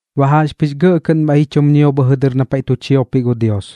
Baꞌ jaꞌxpɨx gɇꞌ kɨꞌn bhaiꞌ ji chum ñio bhɨjɨ dɨr na paiꞌ tu chiopiꞌ gu Dios,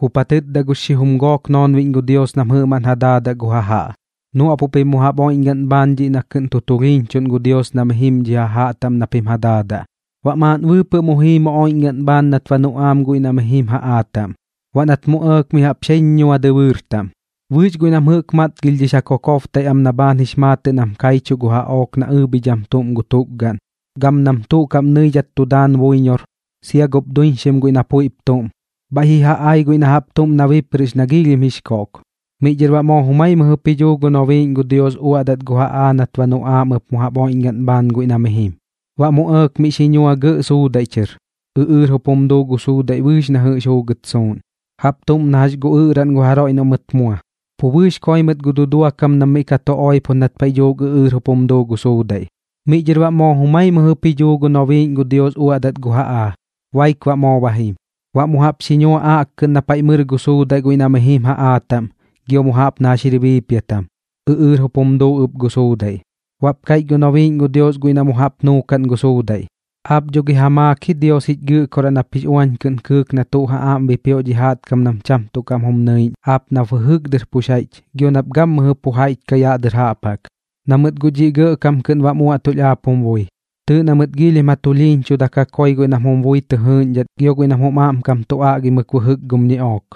jup ja tɨtda gux xijum gook noonbiꞌñ gu Dios nam jɨꞌmaꞌn ja daadaꞌ gu jajaꞌ: ―Nuaꞌpuꞌ pim mu jaꞌp oiꞌñgaꞌn bhaan dhiꞌ na kɨꞌn tu tulhiiñchuꞌn gu Dios na mi jim dhi jajaꞌ taꞌm na pim ja daadaꞌ. Baꞌ maaꞌn bɨɨpɨꞌ mu jii mu oiꞌñgaꞌn bhaan nat ba nuꞌaam guiꞌ na mi jim jaꞌaa taꞌm. Baꞌ nat mu ɇɇk mi jaꞌp xeeñ ñua dɨbɨɨr taꞌm. Bɨɨx guiꞌ nam jɨꞌk matgilhdhix ja kokobtaiꞌ am na bhaan jix maatɨꞌ nam kaichuꞌ gu jaꞌook na ɨɨbhidham tuꞌm gu tukgaꞌn, gam nam tuꞌ kaꞌm nɨidhat tu daan buiñor, sia gup duiñxim na puiꞌp tuꞌm, bhaiꞌ ji ja ai guiꞌ na jaꞌp tuꞌm na biprɨꞌx na giilhim jix koꞌk. Miꞌ dhɨr baꞌ moo jumai mɨjɨp ji dhuu gu nobiiꞌñ gu Dios uaꞌdat gu jaꞌaa nat ba nuꞌaam ɨp mu jaꞌp oiꞌñgaꞌn bhaan guiꞌ na mi jim. Baꞌ mu ɇɇk miꞌ xi ñua gɇꞌ suudaiꞌ chɨr. Ɨꞌɨɨr jup jum duu gu suudaiꞌ bɨɨx na jɨꞌx juugɨt suuꞌn, jaꞌp tuꞌm na jax gu ɨꞌraꞌn gu jaroiꞌ noꞌ mɨt mua. Pu bɨɨx koi mɨt gu dudua kam nam miꞌ ka tu oipo nat paiꞌ dhuuk ɨꞌɨɨr jup jum duu gu suudaiꞌ. Miꞌ dhɨr baꞌ moo jumai mɨjɨp ji dhuu gu nobiiꞌñ gu Dios uaꞌdat gu jaꞌaa, baik baꞌ moo ba jim. Baꞌ mu jaꞌp xi ñua aꞌkkɨꞌn na paiꞌ mɨr gu suudaiꞌ guiꞌ na mi jim jaꞌaa taꞌm gio mu jaꞌp na jax jir biipiatam, ɨꞌɨɨr jup jum duu ɨp gu suudaiꞌ. Baꞌp kaiꞌch gu nobiiꞌñ gu Dios guiꞌ na mu jaꞌp nuukaꞌn gu suudaiꞌ: ―Aap dho gi ja maak ji Dios jich Gɨꞌkoraꞌ nap jix uañ kɨꞌn kɨɨk na tuꞌ ja aꞌm bipioꞌ dhi jaꞌtkam nam cham tuꞌ kaꞌm jum nɨiꞌñ aap nap bɨjɨk dɨr pux jaiꞌch gio nap gammɨjɨ pu jaiꞌch kaꞌ yaꞌ dɨr jaꞌp jaꞌk, na mɨt guꞌ dhiꞌ gɇꞌkam kɨꞌn jum uaꞌtulh aap jum bui. Tɨɨꞌ na mɨt giilhim ja tulhiiñchudaimɨk ja koi guiꞌ nam jum bui tɨ jɨɨꞌñdhat gio guiꞌ nam jum aꞌmkam tu aꞌgimɨk bɨjɨk gum ñiꞌook.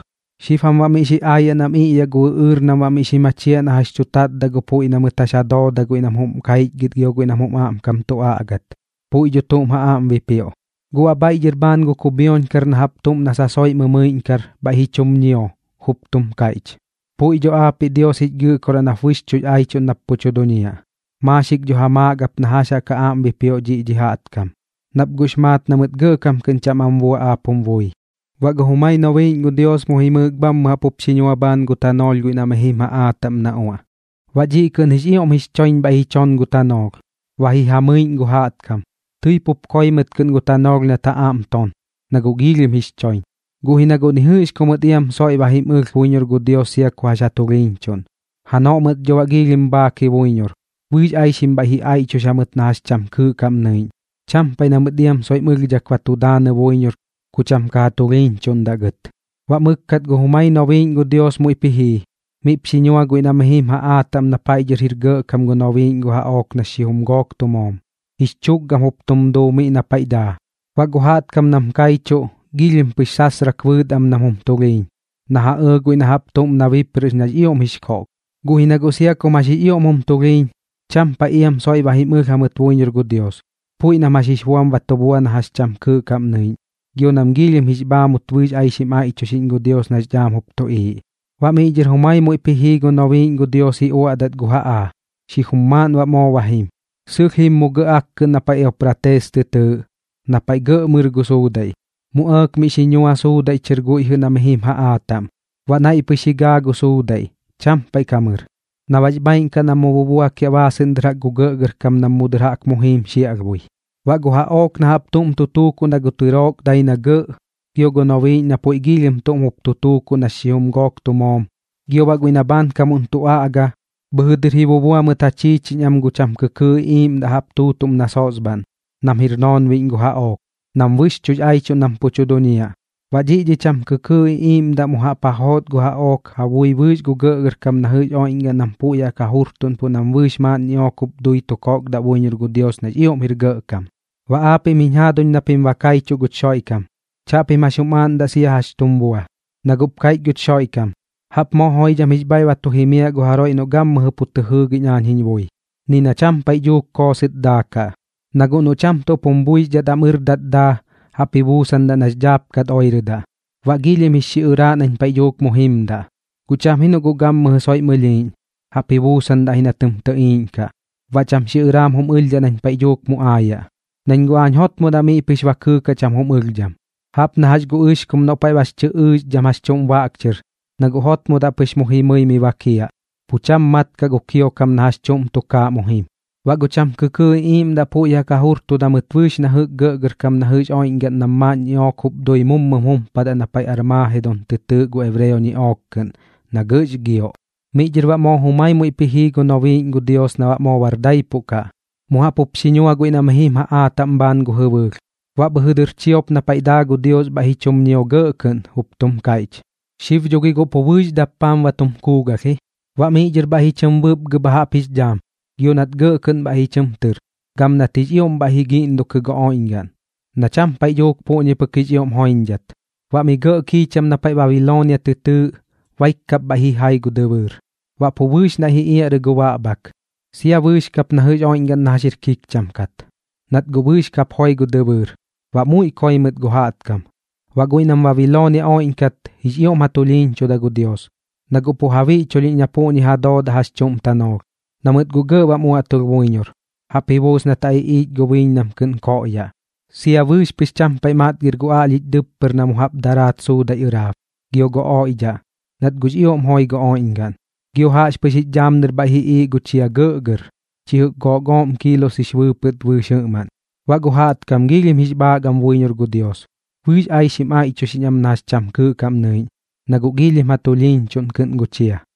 Xib jam baꞌ miꞌ xi aayaꞌ nam iꞌyaꞌ gu ɨꞌɨɨr nam baꞌ miꞌ xi machiaꞌ na jax tu tatdaꞌ gu puiꞌ na mɨt jax ja dooda guiꞌ nam jum kaichgɨt gio guiꞌ nam jum aꞌmkam tu aꞌgat. Puiꞌ dho tuꞌm ja aꞌm bipioꞌ. Guꞌ baꞌ bhaiꞌ dhɨr bhaan gu kubhioñkar na jaꞌp tuꞌm na sasoiꞌ mɨmɨiꞌñkar, bhaiꞌp ji chum ñio, jup tum kaiꞌch: ―Puiꞌ dho aapiꞌ Dios jich Gɨꞌkoraꞌ nap bɨxchuꞌx aichuꞌn nap pu tu duñiaꞌ. Maaxik dho ja maak ap na jax jaꞌk ja aꞌm bipioꞌ dhi jaꞌtkam, nap guꞌx maat na mɨt gɇꞌkam kɨꞌn cham am bua aap jum bui. Baꞌ gu jumai nobiiꞌñ gu Dios mu jimɨɨk bhammɨ jaꞌk jup xi ñua bhaan gu tanoolh guiꞌ na mi jim jaꞌaa taꞌm na uaꞌ. Baꞌ dhiꞌ kɨꞌn jix ioꞌm jix choiñ bhaiꞌ ji chon gu tanoolh, ba ji ja mɨiꞌñ gu jaꞌtkam. Tɨi pup koi mɨt kɨꞌn gu tanoolh nat ja aꞌm ton, na guꞌ giilhim jix choiñ, guꞌ ji na guꞌ ni jɨꞌx ku mɨt iam soiꞌ ba jim ɨlh buiñor gu Dios sia ku jax ja tulhiiñchuꞌn. Janoꞌ mɨt dho baꞌ giilhim bhaak ji buiñor, bɨɨx aixim bhaiꞌ ji aiꞌchux jamɨt na jax cham kɨɨꞌ kaꞌm nɨiꞌñ. Cham paiꞌ na mɨt iam soiꞌm ɨlhdhak ba tu daanɨ buiñor ku cham ka ja tulhiiñchuꞌndaꞌ gɨt. Baꞌ mɨkkat gu jumai nobiiꞌñ gu Dios muiꞌp ji jii, miꞌp xi ñua guiꞌ na mi jim jaꞌaa taꞌm na paiꞌ dhɨr jir gɇꞌkam gu nobiiꞌñ gu jaꞌook nax xijum gook tu moom, jix chukgam jup tum duu miꞌ na paiꞌ daa. Baꞌ gu jaꞌtkam nam kaichuꞌ, giilhim pɨx sasrak bɨɨt am nam jum tulhiiñ, na ja ɇɇ guiꞌ na jaꞌp tuꞌm na biprɨꞌx nax ioꞌm jix koꞌk. Guꞌ ji na guꞌ sia kum jax jum tulhiiñ, cham paiꞌ iam soiꞌ ba jim ɨlh jamɨt buiñor gu Dios, puiꞌ nam jax jix buam ba tu bua na jax cham kɨɨꞌ kaꞌm nɨiꞌñ, gio nam giilhim jix bhaamut bɨɨx aixim aiꞌchuxiꞌñ gu Dios nax dhaam jup tuꞌiiꞌ. Baꞌ miꞌ dhɨr jumai muiꞌp ji jii gu nobiiꞌñ gu Dios uaꞌdat gu jaꞌaa, xijum maaꞌn baꞌ moo ba jim. Sɨlh jim mu gɇꞌ akkɨꞌn na paiꞌ Eupraates tɨ tɨɨꞌ, na paiꞌ gɇꞌ mɨr gu suudaiꞌ. Mu ɇɇk miꞌ xi ñua suudaiꞌ chɨr guiꞌ na mi jim jaꞌaa taꞌm. Baꞌ naiꞌ pɨx ji gaa gu suudaiꞌ, cham paiꞌ ka mɨr, na baꞌx bhaaiꞌn kaꞌ nam mu bubuakiaꞌ baasɨꞌn dɨr jaꞌk gu gɇꞌgɇrkam nam mu dɨr jaꞌk mu jiim xiaꞌlhbui. Baꞌ gu jaꞌook na jaꞌp tuꞌm tu tuukuꞌ na gu tɨrook dai na gɇꞌ, gio gu nobiiꞌñ na puiꞌ giilhim tuꞌm jup tu tuukuꞌ nax xijum gook tu moom, gio baꞌ guiꞌ na bhaankamuꞌn tu aꞌga, bhɨjɨ dɨr ji bubua mɨt ja chiichiñ am gu cham kɨkɨɨꞌ iꞌiiꞌmdaꞌ jaꞌp tuꞌm na sosbhaꞌn, nam jir noonbiꞌñ gu jaꞌook, nam bɨxchuꞌx aichuꞌn nam pu tu duñiaꞌ. Baꞌ dhiꞌ dhi cham kɨkɨɨꞌ iꞌiiꞌmdaꞌ mu jaꞌp ja joot gu jaꞌook ja bui bɨɨx gu gɇꞌgɇrkam na jɨꞌx oiꞌñgaꞌn nam puiꞌ jaꞌk ja jurtuꞌnpoꞌ nam bɨɨx maaꞌn ñiꞌook jup dui tu kokdaꞌ buiñor gu Dios nax ioꞌm jir gɇꞌkam. Baꞌ aapiꞌm jiñ jaaduñ na pim ba kaichuꞌ guch Xoiꞌkam, chaꞌpim jax jum aaꞌndaꞌ sia jax tum bua, na guꞌp kaiꞌch guch Xoiꞌkam: “Jaꞌp moo joidham jix bhaiꞌ tu jimiaꞌ gu jaroiꞌ noꞌ gammɨjɨ pu tɨ jɨɨgiꞌñ aañ jiñ bui, ni na cham paiꞌ dhuuk koosɨt daakaꞌ. Na guꞌ noꞌ cham tuꞌp jum buixdhat am ɨrdat daa, jaꞌp ji buusandaꞌ nax dhaapkat oirɨdaꞌ, baꞌ giilhim jix xiꞌɨraaꞌ nañ paiꞌ dhuuk mu jimdaꞌ. Guꞌ cham ji noꞌ guꞌ gammɨjɨ soiꞌm ɨlhiiꞌñ, jaꞌp ji buusandaꞌ ji na tɨm tɨꞌiiꞌñkaꞌ, baꞌ cham xiꞌɨraam jum ɨlhdhaꞌ nañ paiꞌ dhuuk mu aayaꞌ. Nañ guꞌ aañ jotmodaꞌ miꞌ pɨx ba kɨɨkaꞌ cham jum ɨlhdham, jaꞌp na jax gu ɨxkum noꞌ paiꞌ bax chɨ ɨɨxdham jax chuꞌm baꞌk chɨr, na guꞌ jotmodaꞌ pɨx mu jimɨi mi bakiaꞌ, pu cham mat kaꞌ gu kiokam na jax chuꞌm tukaaꞌ mu jim.” Baꞌ gu cham kɨkɨɨꞌ iꞌiiꞌmdaꞌ puiꞌ jaꞌk ja jujurtuda mɨt bɨɨx na jɨꞌk gu gɇꞌgɇrkam na jɨꞌx oiꞌñgaꞌn nam maaꞌn ñiꞌook jup dui mummɨm jumpadat na paiꞌ Armagedoon tɨ tɨɨꞌ gu ebreo ñiꞌook kɨꞌn, na gɇꞌx gioꞌ. Miꞌ dhɨr baꞌ moo jumai muiꞌp ji jii gu nobiiꞌñ gu Dios na baꞌ moo bar daipuꞌ kaꞌ. Mu jaꞌp jup xi ñua guiꞌ na mi jim jaꞌaa taꞌm bhaan gu jɨbɨɨlh. Baꞌ bhɨjɨ dɨr chiop na paiꞌ daa gu Dios bhaiꞌ ji chum ñio gɇꞌ kɨꞌn, jup tum kaiꞌch: ―Xib dho gi guꞌ pu bɨɨx dappaam ba tum kuugalh ji. Baꞌ miꞌ dhɨr bhaiꞌ ji chɨm bɨpgɨ bha jaꞌp jix dhaam, gio nat gɇꞌ kɨꞌn bhaiꞌ ji chɨm tɨr, gam nat jix ioꞌm bhaiꞌ ji giꞌndokɨ gu oiꞌñgaꞌn, na cham paiꞌ dhuuk puꞌñi pɨk jix ioꞌm joiñdhat. Baꞌ mi gɇꞌ kiicham na paiꞌ Babiloonia tɨ tɨɨꞌ, baik kap bhaiꞌ ji jai gu dɨbɨɨr. Baꞌ pu bɨɨx naiꞌ ji iaꞌrɨ gu baꞌbhak, sia bɨɨx kap na jɨꞌx oiꞌñgaꞌn na jax jir kikcham kat, nat guꞌ bɨɨx kap joi gu dɨbɨɨr, baꞌ muiꞌ koi mɨt gu jaꞌtkam. Baꞌ guiꞌ nam Babiloonia oiꞌñkat, jix ioꞌm ja tulhiiñchuda gu Dios, na guꞌ pu ja biꞌchulhiꞌñ na puꞌñi ja doodaꞌ jax chuꞌm tanoolh, na mɨt guꞌ gɇꞌ bam uaꞌtulh buiñor, jaꞌp ji buus nat ja iꞌiich gu biiñ nam kɨꞌn koꞌyaꞌ. Sia bɨɨx pɨx cham paiꞌ matgir gu aꞌlhich dɨppɨr na mu jaꞌp ka daraat suudaiꞌ ɨraab, gio gu oiꞌdhaꞌ, nat guꞌx ioꞌm joi gu oiꞌñgaꞌn. Gio jaꞌxpɨx jix dhaam dɨr bhaiꞌ ji iiꞌ gu chia gɇꞌgɇr, chi jɨꞌk gook ooꞌm kiilos jix bɨɨpɨt bɨɨx jɨꞌmaꞌn. Baꞌ gu jaꞌtkam giilhim jix bhaak am buiñor gu Dios, bɨɨx aixim aiꞌchuxiꞌñ am na jax cham kɨɨꞌ kaꞌm nɨiꞌñ, na guꞌ giilhim ja tulhiiñchuꞌn kɨꞌn gu chia.